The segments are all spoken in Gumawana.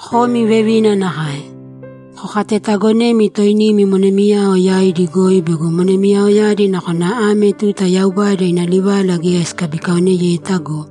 Komi vevina nakae. Kokatetaagonēmi toinimi monemiyao yaidi goi bego monemiyaoyadi nakona ame tuta Yaubada ina livala geya sikabikaoneyeta go,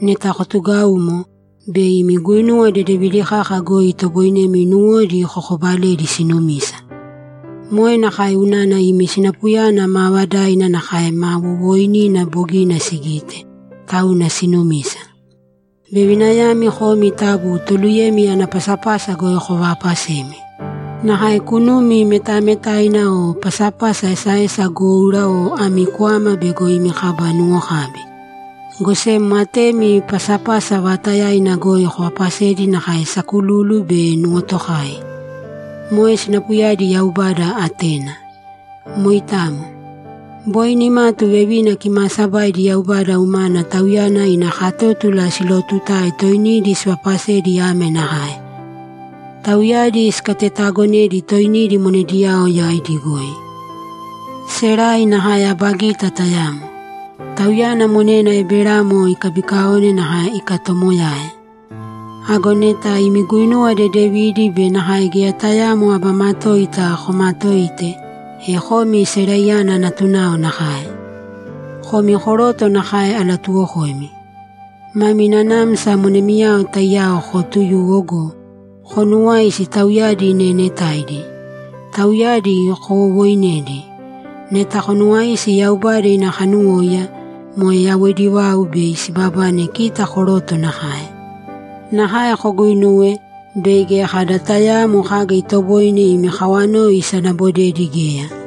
neta kotugaumo, bei imi guinuwa dedevidi kaka goi itoboinemi nuwodi kokobaledi sinumisa. Moe nakae unana imi sinapuyana maavadaina nakae ma wowooinina bogina sigite, tauna sinumisa. Vevinayami komi taabu toluyemi ana pasapasa goi kovaapasēmi. Nakae kunumi metametaina o pasapasa esaesa goura o ami kwama bego imi kaba nuwokabi. Go sem atemi pasapasa vaatayaina goi kovaapasēdi nakae sakululu be nuwotokai. Moe sinapuyadi Yaubada atena. Moitamo. Boi nimatu vevina kimaasabaidi Yaubada umana Tauyana ina katótula silootutae toinidi sivaapasedi ame nakae: Tauyadi sikatetaagonedi toinidi monediyao yaidi goi. Serai nakae aba gita tayamo. Tauyana monena Eberamo ikabikaone nakae ikatomoyae. Ago neta imi guinuwa dedevidi be nakae geya tayaamo aba matoita komaatoite, e komi Seraiyana natunao nakae. Komi koroto nakae alatuwokoimi. Mami nanamsa monemiyao taiyao kootuyūwo go, konuuwāisi tauyadi neenetaidi. Tauyadi kowowooinēdi. Neta konuwaisi Yaubada ina kanuwóiya, moe yawoidi vau, bei sibabane kita koroto nakae. Nakae koguuinūwe, bei geya kada tayaamo kaga itoboine imi kawanoi isanabodedi geya.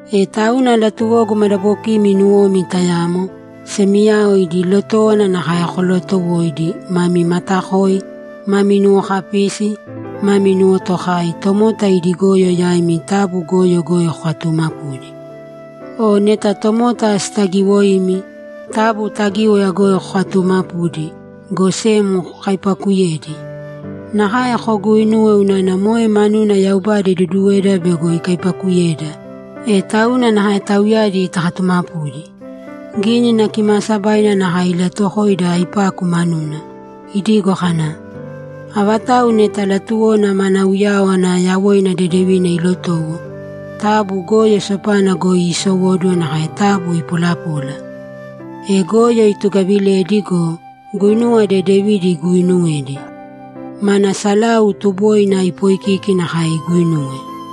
E tauna latuwogu madabokimi nuwomi tayamo, semiyao idi lotówana nakae kolootowōidi, mami matakōi, mami nuwokapīsi, mami nuwotokāi, tomota idi goyo yaimi taabu goyo goi kokatuumapūdi. O neta tomota sitagiwoimi, taabu tagíwaya goi kokatuumapūdi, go sem kokaipaakuyēdi. Nakae koguuinuwe unana moe manuna Yaubada iduduweda bego ikaipaakuyeda, e tauna nakae tauyadi takatumapudi. Gínina Kimaasabaina nakae ilatuwokoida aipaku manuna, idigo kana, ‘Avatau neta latuwona mana uyáwana yawoina dedevina ilotowo, taabu goyo sopana goi iisowōduwo, nakae taabu ipolapōla. E goyo itugavilēdi go, guinuwa dedevidi iguuinuwēdi. Mana salau tuboina ipoikīki nakae iguinuwe.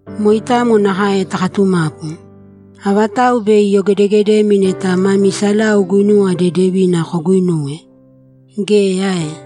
Moitamo nakae takatumapu. Avatau bei iyogedegedemi neta mami salau guinuwa dedevina koguuinuwe? Geya ae?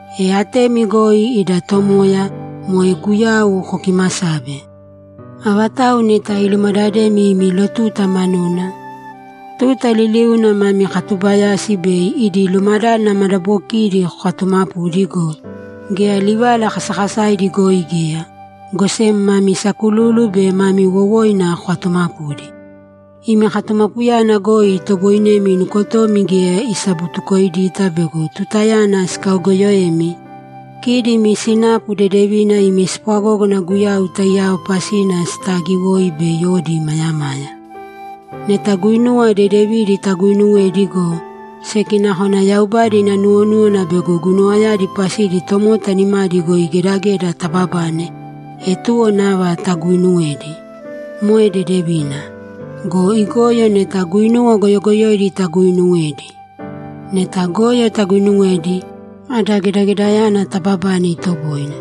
E atemi goi ida Tomoya, moe Guyau, kokiimasābe. Avatau neta ilumadademi imi lotuta manuna, tuta liliuna mami katubayasi bei idi lumadádana madabokidi kokatumapūdi go, geya livala kasakasaidi goi geya, go sem mami sakululu be mami wowoina kokatuumapūdi. Imi katumapuyana goi itoboinemi nukotomi geya isabutukoidita bego tutayana sikaogoyoemi, kidi imi sinapu dedevina imi spwagógana Guyau taiyao pasina sitaagiwoi bei odi imayamaya. Neta guinuwa dedevidi taguuinuwedi go, seki nakona Yaubada ina nuwonúwana bego guinuwayadi pasidi tomota nimadi goi gedageda tababane, e tuwo nava taguuinuwēdi. Moe dedevina. Go igoyo neta guinuwa goyogoyoidi taguuinuwedi. Neta goyo taguuinuwedi, ada gedagedayana taababane itoboine.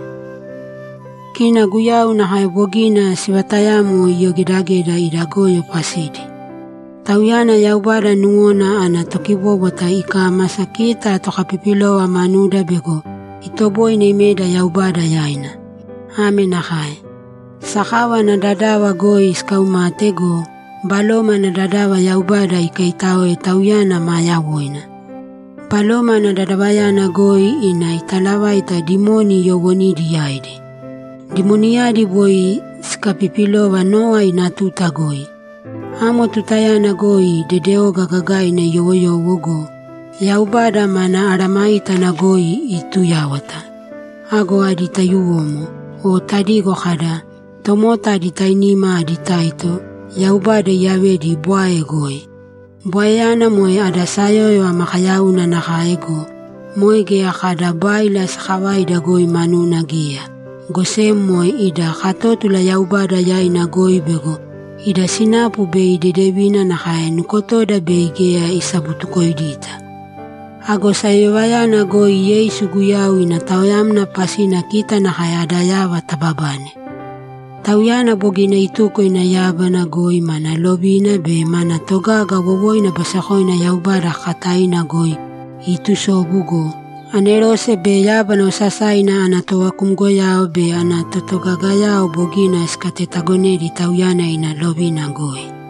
Kina Guyau nakae bogina sivatayamo iyogedageda ida goyo pasidi. Tauyana Yaubada nuwona ana tokibóbwata ikámasa kita tokapipilova manuda bego itoboine imeda Yaubada yaina. Ame nakae: Sakava ana dadava goi sikaumate go, baloma ana dadava Yaubada ikaitáoe Tauyana maa yawoina. Baloma ana dadavayana goi ina italavaita dimoni yoowonidi yaidi. Dimoniyadi boi sikapipilova Nowa ina tuta goi. Amo tutayana goi dedeoga gagaina iyowoyowo go, Yaubada mana mesayágana goi iituyáwata. Ago adi taiyuwomo, o tadigo kada, ‘Tomota adi tainima adi taito’, Yaubada iyavedi bwae goi. Bwaeyana moe ada sayóyova makayauna nakae go, moe geya kada báila sakavaida goi manuna geya, go sem moe ida katótula Yaubada yaina goi bego ida sinapu bei dedevina nakae nukotoda bei geya isabutukoidita. Ago sayoyovayana goi Yeisu Guyau ina taoyamna pasina kita nakae ada yava tababane. Tauyana bogina ituko ina yábana goi mana lovina be mana togaga wowoina basekoina Yaubada kakataina goi iitusobu go, anerose be yábana osasaina ana tovakumgoyao be ana totogagayao bogina sikatetagonedi Tauyana ina lovina goi.